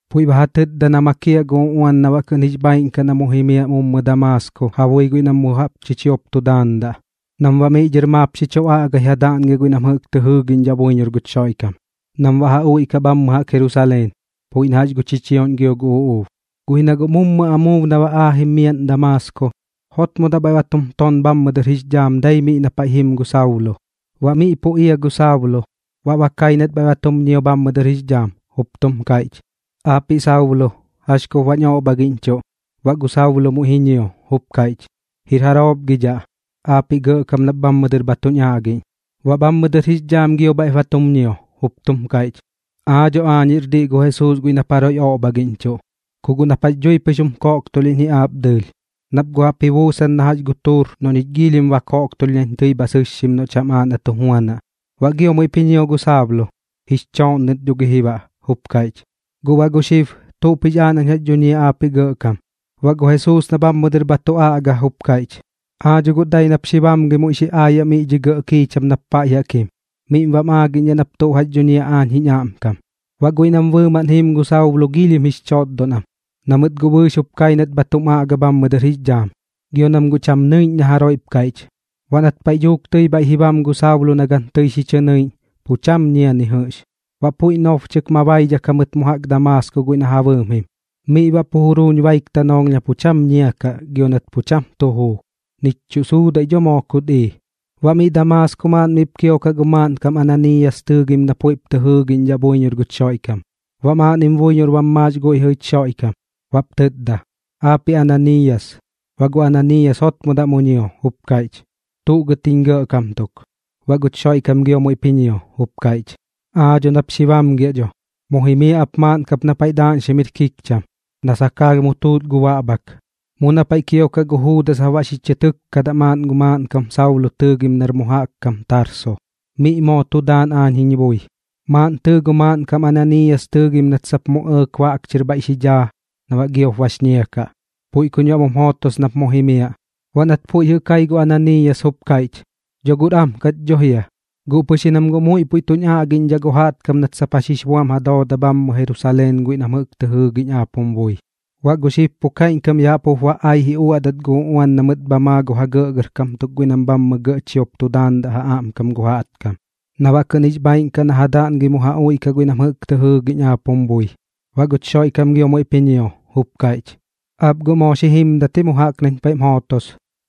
puiꞌ ba tɨtda na makiaꞌ gu uꞌuan na baꞌ kɨꞌn jix bhaaiꞌn kaꞌ na mu jimiaꞌ mummɨ Damaasko ja bui guiꞌ nam mu jaꞌp chichiop tu daandaꞌ, nam baꞌ miꞌ dhɨr maap xi chu aꞌgai ja daꞌngiaꞌ guiꞌ nam jɨꞌk tɨ jɨɨgiꞌñdhaꞌ buiñor guch Xoiꞌkam, nam baꞌ ja uiꞌkaꞌ bhammɨ jaꞌk Jerusaleen, puiꞌ na jax gu chichioꞌñ gio gu uꞌuub. Guꞌ ji na guꞌ mummɨ amuub na ba aajim miaꞌn Damaasko, jotmodaꞌ bhaiꞌ ba tum ton bhammɨ dɨr jix dhaam dai miꞌ na paiꞌ jim gu Saulo. Baꞌ miꞌ pu ia gu Saulo, baꞌ ba kai nat bhaiꞌ ba tum ñio bhammɨ dɨr jix dhaam, jup tum kaiꞌch: ―Aapiꞌ Saulo, ¿jax kup baꞌñ oꞌbhagiꞌñchuꞌ? Baꞌ gu Saulo muiꞌ ji ñio, jup kaiꞌch: ―¿Jir jaroop gi dhaꞌ, aapiꞌ Gɇꞌkam nap bhammɨ dɨr bha tuñ aꞌgiꞌñ? Baꞌ bhammɨ dɨr jix dhaam gio bhaiꞌp ji chum ñio, jup tum kaiꞌch: ―Aa dho aañ jir diꞌ gu Jesuus guiꞌ nap jaroiꞌ oꞌbhagiꞌñchuꞌ. Ku guꞌ nap jax dhui pɨx jum koꞌktulhiꞌñ ji aap dɨɨlh, nap guꞌ jaꞌp ji buusan na gu tuur noꞌ ñich giilhim ba koꞌktulh nañ tɨi bha sɨssɨ noꞌ cham aaꞌ na tu juanaꞌ. Baꞌ gio muiꞌp ji ñio gu Saulo, jix chooꞌnnɨt dho gi ji baꞌ, jup kaiꞌch: ―Guꞌ baꞌ gu xib, ¿tuꞌp jix aaꞌ nañ jax dhuñiaꞌ aapiꞌ Gɇꞌkam? Baꞌ gu Jesuus na bhammɨ dɨr bha tu aꞌga jup kaiꞌch: ―Aa dho guꞌ dai nap xi bamgɨi muiꞌ xi aayaꞌ miꞌ dhi gɇꞌ kiicham nap paiꞌ jaꞌk jim. Miꞌm baꞌm aagiꞌñdhaꞌ nap tuꞌ jax dhuñiaꞌ aañ jiñ aꞌmkam. Baꞌ guiꞌ nam bɨɨmaꞌn jiim gu Saulo giilhim jix chotdon am, na mɨt guꞌ bɨɨx jup kai nat bha tum aꞌga bhammɨ dɨr jix dhaam, gio nam guꞌ cham nɨiꞌñ na jaroiꞌp kaiꞌch. Baꞌ nat paiꞌ dhuuk tɨi bhaiꞌ ji bam gu Saulo na gan tɨi xi chɨ nɨiꞌñ, pu cham ñia ni jɨꞌx. Baꞌ puiꞌ nobchɨk ma baidhak jamɨt mu jaꞌk Damaasko guiꞌ na ja bɨɨm jim. Miꞌ baꞌ pu juruuñ baik tanoolh na pu cham ñia kaꞌ gio nat pu cham tu juu, nich chuꞌ suudaiꞌ dho moo kut ii. Baꞌ mi Damaasko maaꞌn miꞌp kiokaꞌ gu maaꞌnkam Ananiiyas tɨɨgim na puiꞌp tɨ jɨɨgiꞌñdhaꞌ buiñor guch Xoiꞌkam. Baꞌ maaꞌnnim buiñor bam maax guiꞌ jɨꞌ jich Xoiꞌkam, baꞌp tɨtda: ―Aapiꞌ Ananiiyas. Baꞌ gu Ananiiyas jotmodaꞌ mu ñio, jup kaiꞌch: ―¿Tuꞌ gɨt jiñ Gɇꞌkam tuk? Baꞌ guch Xoiꞌkam gio muiꞌp ji ñio, jup kaiꞌch: ―Aa dho nap xi bamgiaꞌ dho, mu jimiaꞌ ap maaꞌn kap na paiꞌ daaꞌñxim jir kikcham, na sakaalh mu tuut gu baꞌbhak. Mu na paiꞌ kiokaꞌ gu Juudas jap baꞌ xi chɨ tɨkkadaꞌ maaꞌn gu maaꞌnkam Saulo tɨɨgim nar mu jaꞌk kam Tarso, miꞌ moo tu daan aañ jiñ bui. Maaꞌn tɨɨ gu maaꞌnkam Ananiiyas tɨɨgim nat sap mu ji ɇɇk baꞌk chɨr bhaiꞌ xi dhaa na baꞌ giop bax ñia kaꞌ. Puiꞌ kuñ baꞌ mum jootos nap mu jimiaꞌ. Baꞌ nat puiꞌ jɨꞌ kai gu Ananiiyas jup kaiꞌch: ―Dho guꞌr am kat dho jia, guꞌ pɨx ji nam guꞌ muiꞌ puiꞌ tuñ aꞌgiꞌñdhaꞌ gu jaꞌtkam nat jax jix buam ja dooda bhammɨ Jerusaleen guiꞌ nam jɨꞌk tɨ jɨɨgiꞌñ aap jum bui. Baꞌ gu xib pu kaiꞌñkam yaꞌ jaꞌk jup ba ai ji uaꞌdat gu uꞌuan na mɨt bha maa gu ja gɇꞌgɇrkam tuk guiꞌ nam bhammɨ gɇꞌ chiop tu daandaꞌ ja aꞌmkam gu jaꞌtkam, na baꞌ kɨꞌn jix bhaaiꞌn kaꞌ na ja daꞌngɨi mu ja uiꞌkaꞌ guiꞌ nam jɨꞌk tɨ jɨɨgiꞌñdhaꞌ aap jum bui. Baꞌ guch Xoiꞌkam gio muiꞌp ji ñio, jup kaiꞌch: ―Aap guꞌ moo xi jimdat ji mu jaꞌk nañ paiꞌm jootos,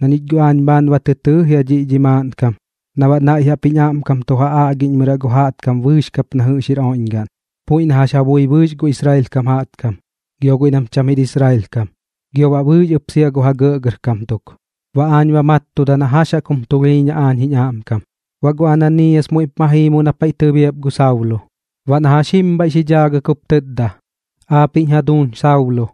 na ñich guꞌ aañ bhaan ba tɨ tɨɨ jia dhiꞌ dhi maaꞌnkam na baꞌ naiꞌ jaꞌp jiñ aꞌmkam tu ja aꞌgiꞌñmɨraꞌ gu jaꞌtkam bɨɨx kap na jɨꞌx jir oiꞌñgaꞌn, puiꞌ na jax ja bui gu Israel kam jaꞌtkam, gio guiꞌ nam cham jir Israel kam, gio baꞌ bɨɨx ɨp sia gu ja gɇꞌgɇrkam tuk. Baꞌ aañ ba mattudaꞌ na jax jaꞌk jum tulhiiñaꞌ aañ jiñ aꞌmkam. Baꞌ gu Ananiiyas muiꞌp ma jii mu na paiꞌ tɨbiap gu Saulo. Baꞌ na jax jim bhaiꞌ xi dhaagɨk jup tɨtda: ―Aapiꞌñ jaduuñ Saulo,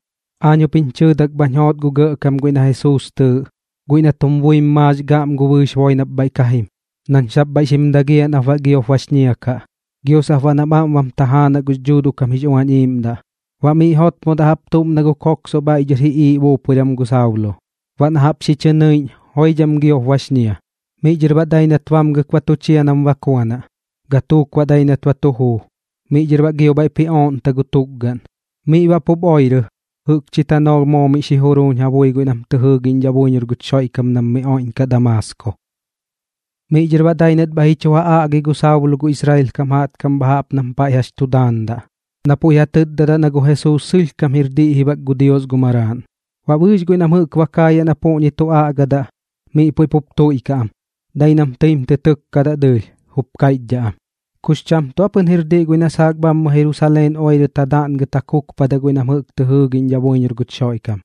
aañ jup jiñ chɨɨdak bhañ joot gu Gɇꞌkam guiꞌ na Jesuus tɨɨꞌ, guiꞌ nat jum buim maax gaꞌm gu bɨɨx boi nap bhaiꞌ ka jim, nañ sap bhaiꞌ xim dagiaꞌ nap baꞌ giop bax ñia kaꞌ, gio sap baꞌ nam aꞌm bam tajaanaꞌ gux Dhuuduꞌ kam jix Uañ Iiꞌmdaꞌ. Baꞌ miꞌ jotmodaꞌ jaꞌp tuꞌm na gu koksoꞌ bhaiꞌ dhɨr ji iiꞌ buupuiran gu Saulo. Baꞌ na jaꞌp xi chɨ nɨiꞌñ, joidham giop bax ñia. Miꞌ dhɨr baꞌ dai nat bamgɨk ba tu chia nam bakuanaꞌ. Gatuuk baꞌ dai nat ba tu juu, miꞌ dhɨr baꞌ gio bhaiꞌp ji ooꞌnta gu tukgaꞌn. Miꞌ baꞌ pup oirɨ, jɨꞌkchi tanoolh moo miꞌ juruuñ ja bui guiꞌ nam tɨ jɨɨgiꞌñdhaꞌ buiñor guch Xoiꞌkam nam miꞌ oiꞌñkaꞌ Damaasko. Miꞌ dhɨr baꞌ dai nat bhaiꞌ ji chu ja aꞌgi gu Saulo gu Israel kam jaꞌtkam bha jaꞌp nam paiꞌ jax tu daandaꞌ, na puiꞌ ja tɨtdadaꞌ na gu Jesuus sɨlhkam jir diꞌ ji bak gu Dios gu Maraaꞌn. Baꞌ bɨɨx guiꞌ nam jɨꞌk ba kaayaꞌ na puꞌñi tu aꞌgadaꞌ, miꞌ puiꞌ pup tuiꞌkaꞌ am, dai nam tɨim tɨ tɨkkadaꞌ dɨɨlh, jup kaiꞌchdhaꞌ am: ―¿Kux cham tuꞌ aa pɨn jir diꞌ guiꞌ na saak bhammɨ Jerusaleen oirɨt ja daꞌngɨt ja kukpadaꞌ guiꞌ nam jɨꞌk tɨ jɨɨgiꞌñdhaꞌ buiñor guch Xoiꞌkam,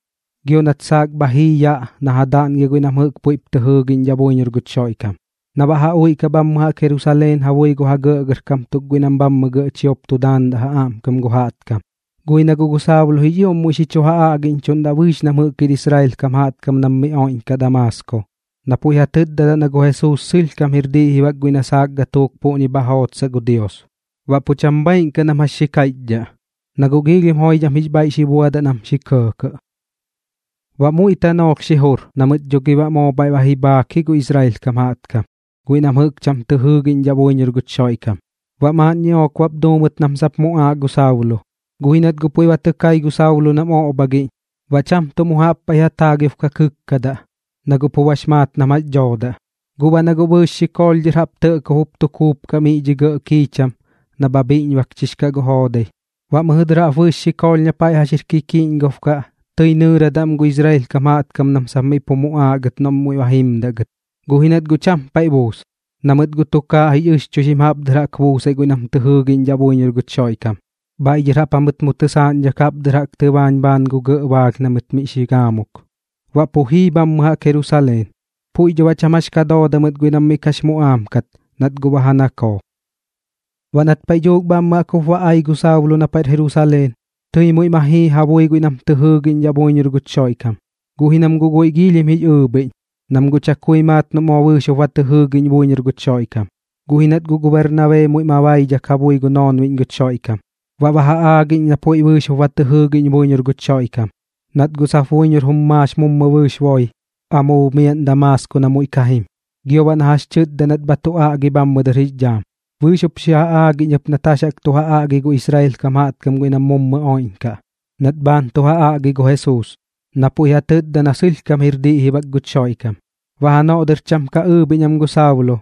gio nat saak bha jii yaꞌ na ja daꞌngiaꞌ guiꞌ nam jɨꞌk puiꞌp tɨ jɨɨgiꞌñdhaꞌ buiñor guch Xoiꞌkam, na baꞌ ja uiꞌkaꞌ bhammɨ jaꞌk Jerusaleen ja bui gu ja gɇꞌgɇrkam tuk guiꞌ nam bhammɨ gɇꞌ chiop tu daandaꞌ ja aꞌmkam gu jaꞌtkam? Guꞌ ji na guꞌ gu Saulo jix ioꞌm muiꞌ xi chu ja aꞌgiꞌñchuꞌndaꞌ bɨɨx nam jɨꞌk jir Israel kam jaꞌtkam nam miꞌ oiꞌñkaꞌ Damaasko, na puiꞌ ja tɨtdadaꞌ na gu Jesuus sɨlhkam jir diꞌ ji bak guiꞌ na saak gatuuk puꞌñi bha jootsaꞌ gu Dios. Baꞌ pu cham bhaaiꞌn kaꞌ nam jax xi kaiꞌchdhaꞌ, na guꞌ giilhim joidham jix bhaiꞌ xi buadaꞌ nam kɇɇkɇꞌ. Baꞌ muiꞌ tanoolh xi jur na mɨt dho gi baꞌ moo bhaiꞌ ba ji bhaak ji gu Israel kam jaꞌtkam guiꞌ nam jɨꞌk cham tɨ jɨɨgiꞌñdhaꞌ buiñor guch Xoiꞌkam, baꞌ maaꞌn ñiꞌook bap duu mɨt nam sap muꞌaaꞌ gu Saulo. Guꞌ ji nat guꞌ puiꞌ ba tɨ kai gu Saulo nam oꞌbhagiꞌñ, baꞌ cham tuꞌ mu jaꞌp paiꞌ ja taagiob ka kɨkkadaꞌ, na guꞌ bax maat nam jax dhoodaꞌ. Guꞌ baꞌ na guꞌ bɨɨx xikoolh dhɨr jaꞌp tɇꞌkob jup tu kuupkaꞌ miꞌ dhi gɇꞌ kiicham na bha bhiꞌñbakchix kaꞌ gu joodai, baꞌ mɨjɨ dɨr jaꞌp bɨɨx xikoolh na paiꞌ jax jir kikiꞌñgob kaꞌ tɨi nɨɨradaꞌ am gu Israel kam jaꞌtkam nam sap miꞌ pu muꞌaaꞌ gɨt noꞌ muiꞌ ba jimdaꞌ gɨt. Guꞌ ji nat guꞌ cham paiꞌ ji buus, na mɨt guꞌ tukaaꞌ jix ɨxchuixim jaꞌp dɨr jaꞌk buusaiꞌ guiꞌ nam tɨ jɨɨgiꞌñdhaꞌ buiñor guch Xoiꞌkam, bhaiꞌ dhɨr jaꞌp jamɨt mu tɨsaaꞌñdhak jaꞌp dɨr jaꞌk tɨbaañ bhaan gu gɇꞌ baalh na mɨt miꞌ xi gaamuk. Baꞌ pu jii bhammɨ jaꞌk Jerusaleen. Puiꞌ dho baꞌ pu cham jax dhooda mɨt guiꞌ nam miꞌ kax muꞌaam kat nat guꞌ ba ja nakoo. Baꞌ nat paiꞌ dhuuk bhammɨ jaꞌk jup ba ai gu Saulo na paiꞌr Jerusaleen, tɨi muiꞌ ma jii ja bui guiꞌ nam tɨ jɨɨgiꞌñdhaꞌ buiñor guch Xoiꞌkam. Guꞌ ji nam guꞌ guiꞌ giilhim jix ɨɨbhiꞌñ, nam guꞌ chakui maat noꞌ moo bɨɨx jup ba tɨ jɨɨgiꞌñ buiñor guch Xoiꞌkam. Guꞌ ji nat guꞌ gu Bernabee muiꞌ ma baidhak ja bui gu noonbiꞌñ guch Xoiꞌkam, baꞌ ba ja aagiꞌñ na puiꞌ bɨɨx jup ba tɨ jɨɨgiꞌñ buiñor guch Xoiꞌkam, nat guꞌ sap buiñor jum maax mummɨ bɨɨx boi amuub miaꞌn Damaasko na muiꞌ ka jim, gio baꞌ na jax tɨtda nat bha tu aꞌgi bhammɨ dɨr jix dhaam, bɨɨx jup xi ja aagiꞌñ ɨp nat jax jaꞌk tu ja aꞌgi gu Israel kam jaꞌtkam guiꞌ nam mummɨ oiꞌñkaꞌ, nat bhaan tu ja aꞌgi gu Jesuus, na puiꞌ ja tɨtda na sɨlhkam jir diꞌ ji bak guch Xoiꞌkam. Baꞌ janoꞌ dɨr cham ka ɨɨbhiꞌñ am gu Saulo,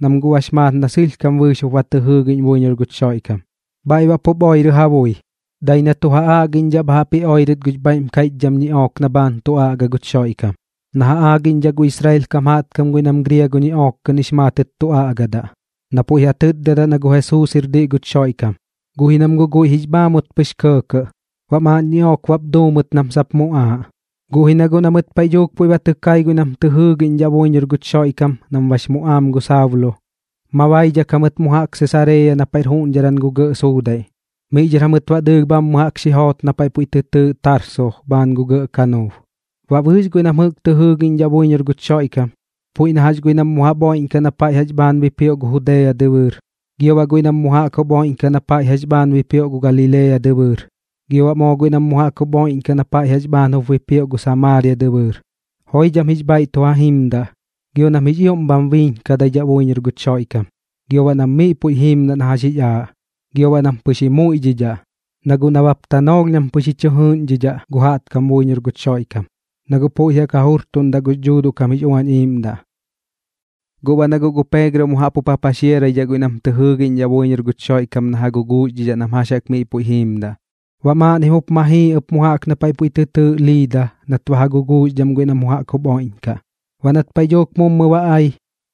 nam guꞌ bax maat na sɨlhkam bɨɨx jup ba tɨ jɨɨgiꞌñ buiñor guch Xoiꞌkam. Bhaiꞌ baꞌ pup oirɨ ja bui, dai baꞌ na tu ja aꞌgiꞌñdhaꞌ bha jaꞌp ji oirɨt gux bhaiꞌm kaiꞌchdham ñiꞌook na bhaan tu aꞌga guch Xoiꞌkam, na ja aagiꞌñdhaꞌ gu Israel kam jaꞌtkam guiꞌ nam griago ñiꞌook kɨꞌn jix maatɨt tu aꞌgadaꞌ, na puiꞌ ja tɨtdadaꞌ na gu Jesuus jir diꞌ guch Xoiꞌkam. Guꞌ ji nam guꞌ guiꞌ jix bhaamut pɨx kɇɇkɇꞌ, baꞌ maaꞌn ñiꞌook bap duu mɨt nam sap muꞌaaꞌ. Guꞌ ji na guꞌ na mɨt paiꞌ dhuuk puiꞌ ba tɨ kai guiꞌ nam tɨ jɨɨgiꞌñdhaꞌ buiñor guch Xoiꞌkam nam bax muꞌaam gu Saulo, ma baidhak jamɨt mu jaꞌk Sesareeya na paiꞌr juꞌñdharan gu gɇꞌ suudaiꞌ, miꞌ dhɨr jamɨt baꞌ dɨɨlh bhammɨ dɨr jaꞌk xi joot na paiꞌ puiꞌ tɨ tɨɨꞌ Tarso bhaan gu gɇꞌ kanuub. Baꞌ bɨɨx guiꞌ nam jɨꞌk tɨ jɨɨgiꞌñdhaꞌ buiñor guch Xoiꞌkam, puiꞌ na jax guiꞌ nam mu jaꞌp oiꞌñkaꞌ na paiꞌ jax bhaan bipioꞌ gu Judea dɨbɨɨr, gio baꞌ guiꞌ nam mu jaꞌk jup oiꞌñkaꞌ na paiꞌ jax bhaan jup bipioꞌ gu Galilea dɨbɨɨr, gio baꞌ guiꞌ nam mu jaꞌk jup oiꞌñkaꞌ na paiꞌ jax bhaan jup bipioꞌ gu Samaaria dɨbɨɨr, joidham jix bhaiꞌ tu ja jimdaꞌ, gio nam jix ioꞌm bha biiñkaidhaꞌ buiñor guch Xoiꞌkam, gio baꞌ nam miꞌ puiꞌ jiimdaꞌ na jax jix aaꞌ. Gio baꞌ nam pɨx ji muiꞌdhidhaꞌ, na guꞌ nabap tanoolh nam pɨx ji chɨ jɨɨꞌñdhidhaꞌ gu jaꞌtkam buiñor guch Xoiꞌkam, na guꞌ puiꞌ jaꞌk ja jurtuꞌnkaꞌ gux Dhuuduꞌ kam jix Uañ Iiꞌmdaꞌ. Gu baꞌ na guꞌ gu Peegro mu jaꞌp jup ja paxiaraidhaꞌ guiꞌ nam tɨ jɨɨgiꞌñdhaꞌ buiñor guch Xoiꞌkam na ja guguuxdhidhaꞌ nam jax jaꞌk miꞌ puiꞌ jiimdaꞌ. Baꞌ maaꞌnnim jup ma jii ɨp mu jaꞌk na paiꞌ puiꞌ tɨ tɨɨꞌ Liida nat ba ja guguuxdham guiꞌ nam mu jaꞌk jup oiꞌñkaꞌ. Baꞌ nat paiꞌ dhuuk mummɨ ba ai,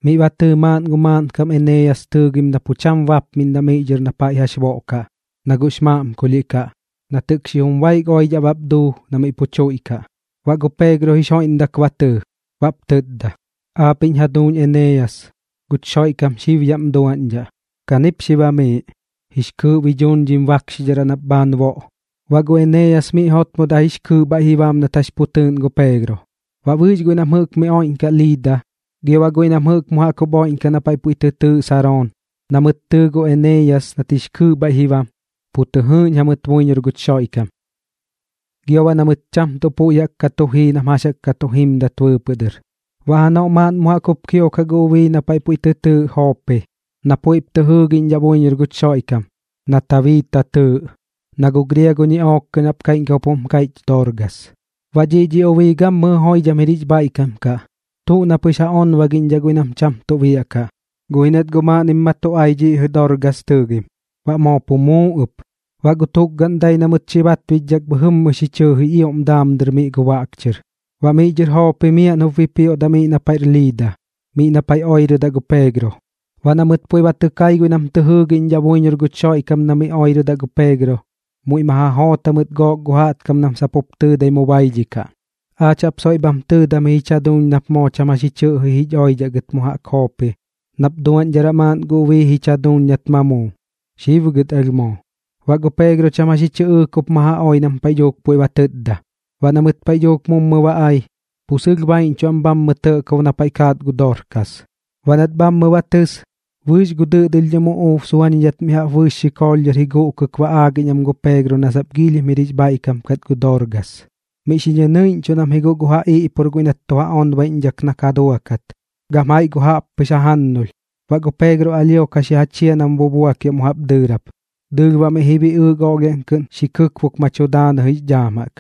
miꞌ ba tɨɨ maaꞌn gu maaꞌnkam Eneeyas tɨɨgim na pu cham bapmiꞌndaꞌ miꞌ dhɨr na paiꞌ jax boꞌkaꞌ, na guꞌx maꞌmkulhiꞌ kaꞌ, nat jɨꞌk xijum baik oidhaꞌ bap duu na miꞌ pu tuiꞌkaꞌ. Baꞌ gu Peegro jix joiꞌmdak ba tɨɨ, baꞌp tɨtda: ―Aapiꞌñ jaduuñ Eneeyas, guch Xoiꞌkam xib yaꞌm duaꞌñdhaꞌ. Kanip xi bamiiꞌ, jix kɨɨꞌ bi dhuuñ dhim bakxidharaꞌ nap bhaan boꞌ. Baꞌ gu Eneeyas miꞌ jotmodaꞌ jix kɨɨꞌ bhaiꞌ ji bam nat jax pu tɨɨꞌn gu Peegro. Baꞌ bɨɨx guiꞌ nam jɨꞌk miꞌ oiꞌñkaꞌ Liida, gio baꞌ guiꞌ nam jɨꞌk mu jaꞌk jup oiꞌñkaꞌ na paiꞌ puiꞌ tɨ tɨɨꞌ Saroon, na mɨt tɨɨ gu Eneeyas nat jix kɨɨꞌ bhaiꞌ ji bam, pu tɨ jɨɨꞌñ jamɨt buiñor guch Xoiꞌkam, gio baꞌ na mɨt cham tuꞌ puiꞌ jaꞌk ka tu jii nam jax jaꞌk ka tu jimdat bɨɨpɨꞌ dɨr. Baꞌ janoꞌ maaꞌn mu jaꞌk jup kiokaꞌ gu ubii na paiꞌ puiꞌ tɨ tɨɨꞌ Joopi, na puiꞌp tɨ jɨɨgiꞌñdhaꞌ buiñor guch Xoiꞌkam, na Tabiita tɨɨꞌ, na gu griago ñiꞌook kɨꞌn jaꞌp kaiꞌñkam jup jum kaiꞌch Dorgas. Baꞌ dhiꞌ dhi ubii gammɨjɨ joidham jir jix bhaiꞌkam kaꞌ, tuꞌ na pɨx ja onbagiꞌñdhaꞌ guiꞌ nam cham tuꞌ biaꞌkaꞌ. Guꞌ ji nat guꞌ maaꞌnnim ma tu ai dhiꞌ jɨꞌ dhi Dorgas tɨɨgim, baꞌ moo pu muu ɨp. Baꞌ gu tukgaꞌn dai na mɨt xi batbichdhak bhɨjɨmmɨ xi chɨɨ jix ioꞌm daam dɨr miꞌ gu baꞌk chɨr. Baꞌ miꞌ dhɨr Joopi miaꞌn jup bipioꞌdaꞌ miꞌ na paiꞌr Liida, miꞌ na paiꞌ oirɨdaꞌ gu Peegro. Baꞌ na mɨt puiꞌ ba tɨ kai guiꞌ nam tɨ jɨɨgiꞌñdhaꞌ buiñor guch Xoiꞌkam na miꞌ oirɨdaꞌ gu Peegro, muiꞌ ma ja joot jamɨt gook gu jaꞌtkam nam sap jup tɨɨdai mu baidhikaꞌ: ―Aach jap soiꞌ bham tɨɨdam jich jaduuñ nap moo cham jax ji chɨꞌji jich oidhaꞌ gɨt mu jaꞌk Joopi nap duaꞌñdharaꞌ maaꞌn gu ubii jich jaduuñ nat ma muu. Xib gɨt alh moo. Baꞌ gu Peegro cham jax ji chɨꞌɨɨk jup ma ja oi nam paiꞌ dhuuk puiꞌ ba tɨtda. Baꞌ na mɨt paiꞌ dhuuk mummɨ ba ai, pu sɨlh baiꞌñchuꞌ am bhammɨ tɇꞌkob na paiꞌ kaat gu Dorgas. Baꞌ nat bhammɨ ba tɨs, bɨɨx gu dɨꞌdɨlhdhɨm uꞌuub suañidhat mi jaꞌp bɨɨx xikoolh ji guꞌkɨk ba aagiꞌñ am gu Peegro na sap giilhim jir jix bhaiꞌkam kat gu Dorgas. Miꞌ xi ñɨnɨiꞌñchuꞌn am ji guꞌ gu ja iꞌpur guiꞌ nat tu ja onbaiꞌñdhak na ka duakat, gam jaiꞌ gu jaꞌppɨx jajannulh. Baꞌ gu Peegro alhio ka xi ja chia nam bubuakiaꞌ mu jaꞌp dɨɨrap, dɨɨlh baꞌ miꞌ ji biꞌɨɨk oꞌlhiaꞌn kɨꞌn xi kɨkbuk ma tu daanɨ jix dhaam jaꞌk.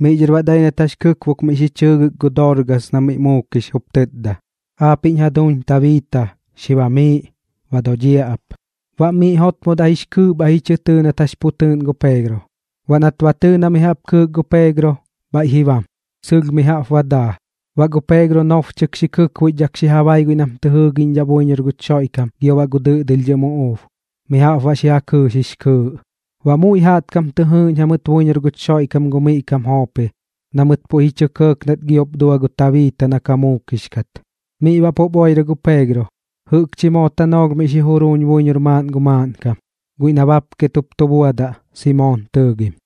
Miꞌ dhɨr baꞌ dai nat jax kɨkbok miꞌ xi chɨɨgɨk gu Dorgas na miꞌ muukix, jup tɨtda: ―Aapiꞌñ jaduuñ Tabiita, xi bamiiꞌ. Ba dodhiaꞌ ap. Baꞌ miꞌ jotmodaꞌ jix kɨɨꞌ bhaiꞌ ji chɨ tɨɨ nat jax pu tɨɨꞌn gu Peegro. Baꞌ nat ba tɨɨ na mi jaꞌp kɨɨk gu Peegro, bhaiꞌ ji bam, sɨlh mi jaꞌp ba daa. Baꞌ gu Peegro nobchɨk xi kɨkbuichdhak xi ja bai guiꞌ nam tɨ jɨɨgiꞌñdhaꞌ buiñor guch Xoiꞌkam gio baꞌ gu dɨꞌdɨlhdhɨm uꞌuub, mi jaꞌp baꞌ xi ja kɨɨx jix kɨɨꞌ. Baꞌ muiꞌ jaꞌtkam tɨ jɨɨꞌñ jamɨt buiñor guch Xoiꞌkam gu miꞌ kam Joopi na mɨt puiꞌ ji chɇ kɇɇk nat giop dua gu Tabiita na ba muukix kat. Miꞌ baꞌ pup oirɨ gu Peegro, jɨꞌkchi moo tanoolh miꞌ xi juruuñ buiñor maaꞌn gu maaꞌnkam, guiꞌ na bapket jup tu buadaꞌ, Simoon tɨɨgim.